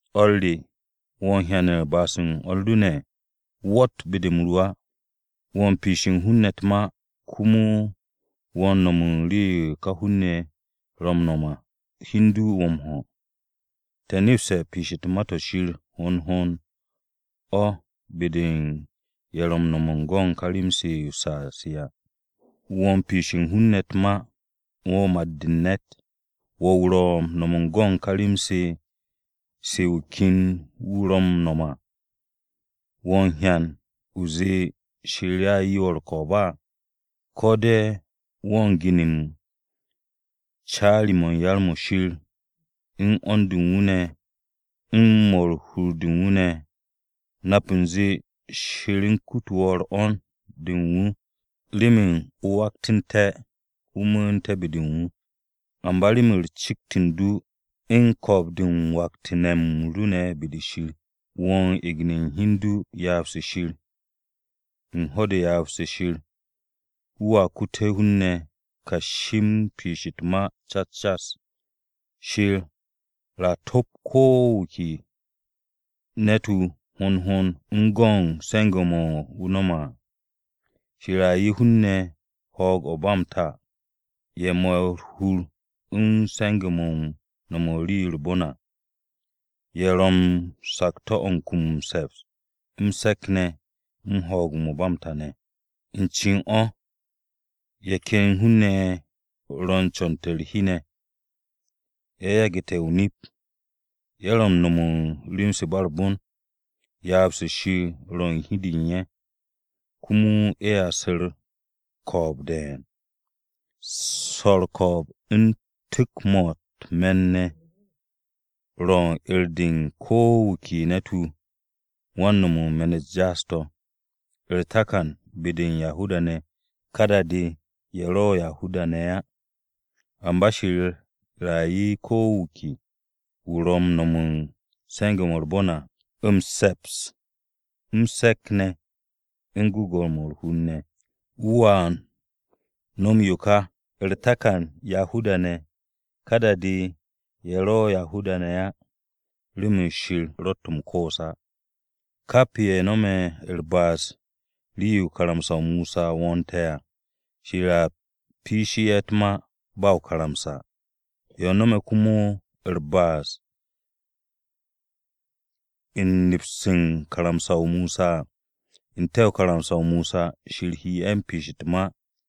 ¿O̱r re, wo̱ u̱n hyan u̱n ba'as-u̱r o̱r ru ne̱? Wo̱tt be-de m-ru á. Wo̱ u̱n piishe̱ u̱n hun-ne̱ u̱t-ma komo wo̱ m-no̱m u̱n rii-yo ká hun-ne̱ ye̱ ro̱ m-nom à, hi u̱n du wo̱ m-ho̱. Te̱ nepste̱ piish u̱t-ma to̱ Shir hond hond o̱ be-de u̱n ye̱ ro̱ m-no̱m u̱n go̱n ká rem-se o-saa se à. Wo̱ u̱n piishe̱ hun-ne̱ u̱t-ma. Wo̱ mat-de u̱n ne̱t, wo̱ wu̱ ro̱ m-no̱m u̱n go̱n ká rem-se wu̱ ken wu̱ ro̱ m-no̱m à, ¿Wo̱ m-hyan o zee Shir a 'ye wo̱ u̱r-ko̱o̱b á? ¿Ko̱ de̱ wo̱ u̱n gini u̱n caari-mo̱ u̱n yar-mo̱ Shir u̱n 'wo̱n-de u̱n wu̱ ne̱, u̱n mo̱ u̱n hur-de u̱n wu̱ ne̱? Nap u̱nze Shir u̱n kute̱ wo̱ 'wo̱n-de u̱n wu̱ remen o waktu̱nté̱ o mu̱u̱n be-de u̱n wu̱. Amba remen cikt u̱n du u̱n ko̱o̱b-de u̱n waktu̱ne̱-m ru ne̱ be-de Shir, wo̱ u̱n egne̱ u̱n hi u̱n du ryaab-se Shir. U̱n ho̱-de ryaab-se Shir, wu̱a kute̱ hun-ne̱ kashi u̱n piish u̱t-ma cas cas. Shir “a top ko̱ wu̱ ke ne̱t-wu̱ hond hond u̱n go̱n se̱nge̱-mo̱ wu̱ no̱me̱ à.” Shir a 'ye hun-ne̱ ho̱o̱g-o̱ u̱n ba m-ta ye̱ mo̱'e̱ u̱r-hur u̱n se̱nge̱-mo̱ u̱n no̱m u̱n rii-yo u̱r-bon à, ye̱ ro̱ u̱n sakto̱-o̱ u̱n kum m-se̱ps, m-se̱k ne̱, u̱n ho̱o̱g-o̱ ba m-ta ne̱. U̱n cen o̱ ye̱ ken hun-ne̱ ye̱ ro̱ u̱n co̱n-to̱ u̱r-hi ne̱, ye̱ yage̱ o-nip à, ye̱ ro̱ u̱n no̱m u̱n rem-se u̱n ba u̱r-bon, ryaab-se Shir ro̱ u̱n hi-de u̱n ye̱, komo ye̱a su̱ u̱r-ko̱o̱b de̱e̱n. Swo̱ u̱r-ko̱o̱b u̱n tu̱k-mo̱ u̱t-me̱n ne̱ ro̱ u̱n 'er-de u̱n ko̱ wu̱ ke ne̱t-wu̱ wan-no̱m u̱n me̱n-u̱t jaas-to̱, u̱r-takan be-de u̱n Yahuda-ne̱, ka da-de, ye̱ ro̱ Yahuda-ne̱ á. Amba Shir a 'ye ko̱ wu̱ ke wu̱ ro̱ m-no̱m u̱n se̱nge̱-mo̱ u̱r-bon à, m-se̱ps, m-se̱k ne̱, u̱n gwu̱gwu̱-mo̱ u̱r-hur ne̱. Wu̱a no̱m yo ka, u̱r-takan Yahuda-ne̱, ka da-de, ye̱ ro̱ Yahuda-ne̱ á. Remen Shir ro̱tt m-koos á. Kap ye̱ no̱me̱ u̱r-ba'as rii-yo karamsa-o Mosa wo̱o̱nte̱ à, Shir a piishe̱ ye̱ u̱t-ma ba o-karamsa. Ye̱ no̱me̱ komo u̱r-ba'as u̱n neps u̱n karamsa-o Mosa à, n-te̱ u̱n karamsa-o Mosa, Shir he ye̱ piishe̱ u̱t-ma.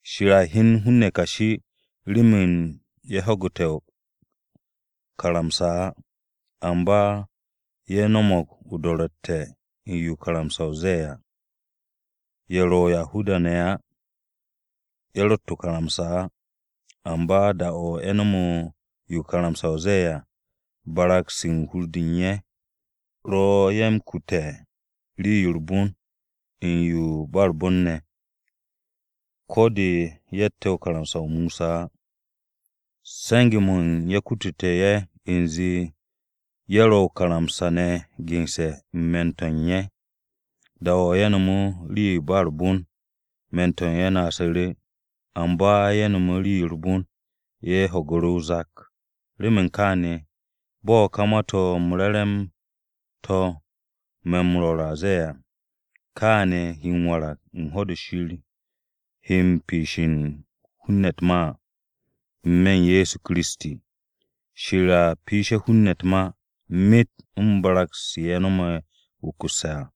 Shir a hyen hun-ne̱ kashi remen ye̱ ho̱gu̱te̱ o-karamsa á, amba se̱ ye̱ no̱mo̱g o-do̱ro̱tte̱ o̱ u̱n yo karamsa-o ze̱e̱ à. Ye̱ ro̱ Yahuda-ne̱ á, ye̱ rott o-karamsa á, amba da-o̱ ye̱ no̱me̱ yo karamsa-o ze̱e̱ à, barag-se u̱n hur-de u̱n ye̱ ro̱ ye̱ m-kute̱ rii-yo u̱r-bon u̱n yo u̱n ba u̱r-bon ne̱, ko̱ de ye̱tte̱ karamsa-o Mosa á. Se̱nge̱-mo̱ u̱n ye̱ kutute̱ ye̱ u̱nze ye̱ ro̱ o-karamsa ne̱ gense̱ u̱n hur-de u̱n ye̱. Da-o̱ ye̱ nome̱ rii-yo u̱n ba u̱r-bon, hur-de u̱n ye̱ naasu̱ru̱, amba ye̱ no̱me̱ rii-yo u̱r-bon ye̱ ro̱ u̱n ho̱ge̱ o-zak. Remen kaane̱, bo̱ ka Ma-to̱ m-Re̱re̱m to̱ me̱ m-rwo̱r ze̱e̱ à, kaane̱ he m-warag u̱n ho̱-de Shir he piishe̱ u̱n hun-ne̱ u̱t-ma à, n-me̱ u̱n Ye̱so Kiristi. Shir a piishe̱ hun-ne̱ u̱t-ma, myet u̱n barag-se ye̱ no̱me̱ wukusse̱ à.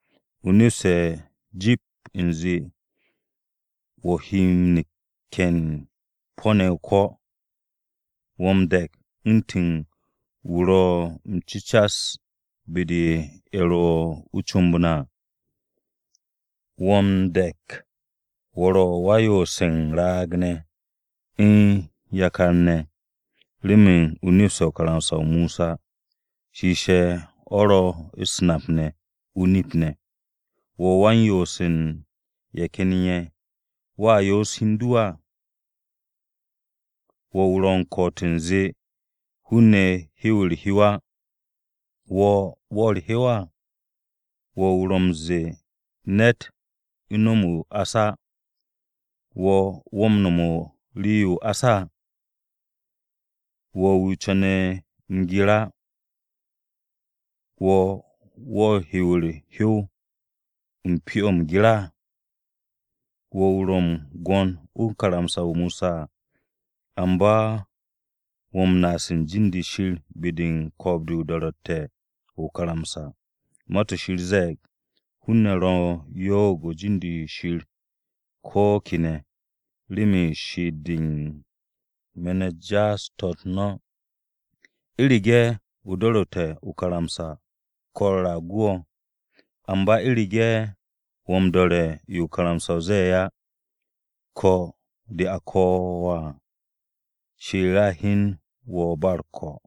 O nepste̱ jip u̱nze wo̱ he neke̱n po̱-ne̱ o-ko̱, wo̱ m-de̱k u̱ntu̱n wo̱ ro̱ m-cu̱cas be-de u̱n ye̱ ro̱ o-comb à. Wo̱ m-de̱k wo̱ ro̱ wan-yoose̱ u̱n raag-ne̱, u̱n yakar-ne̱, remen o nepse̱ karamsa-o Mosa shiishe̱ o̱ ro̱ u̱s-nap ne̱, o-nip ne̱. Wo̱ wan u̱n yoose̱ u̱n ye̱ ken ye̱, ¿wo̱a yoose̱ hi u̱n du? Wo̱ wu̱ ro̱ m-ko̱'o̱t u̱nze hun-ne̱ hiw u̱r-hyow á. Wo̱, ¿wo̱ u̱r-hyow á? Wo̱ wu̱ ro̱ m-ze̱e̱ ne̱t no̱m o-ás á, wo̱, ¿wo̱ m-no̱m u̱n rii-yo o-ás á? Wo̱ wu̱ co̱ne̱ m-gir á. Wo̱, ¿wo̱ m-hiw u̱r-hyow u̱n pyo-o̱ m-gir? Wo̱ wu̱ ro̱ m-gwo̱n u̱n karamsa-o Mosa à. Amba wo̱ m-naas u̱n jin-de Shir be-de u̱n ko̱o̱b-de o-do̱ro̱tte̱ o̱ o-karamsa. Ma-to̱ Shir ze̱e̱g, “Hun-ne̱ ro̱ u̱n yo'og u̱n jin-de Shir ko̱ kene̱ remen she'et-de u̱n me̱n-u̱t jaas-to̱-u̱t no̱.” U̱rege̱ o do̱ru̱te̱ o-karamsa, ko̱-u̱r a gu wo̱, amba u̱rege̱ wo̱ m-do̱re̱ yo karamsa-o ze̱e̱ á, ko̱ de a ko̱ wo̱ à, Shir a hyen wo̱ ba u̱r-ko̱.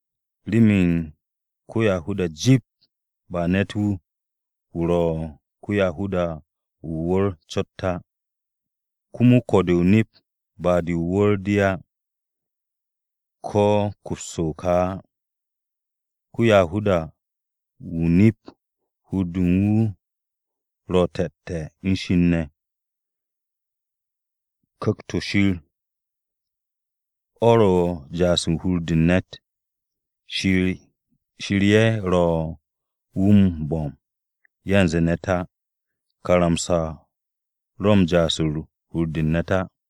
Remen ko-Yahuda jip ba ne̱t-wu̱, wu̱ ro̱ ko-Yahuda o-wu̱r cot á. Komo ko̱-de o-nip ba de o-wu̱r de á, ko̱ kups o-ka á. Ko-Yahuda-wu̱ o-nip hur-de u̱n wu̱ ro̱ te̱te̱ u̱n Shir ne̱. Ku̱kt-o̱ Shir o̱ ro̱ u̱n m-ja'as u̱n hur-de u̱n ne̱t. Shir-ye̱ ro̱ wu̱ m-bo̱m, yanze ne̱t á. Karamsa-o ro̱ m-ja'as u̱n hur-de u̱n ne̱t á.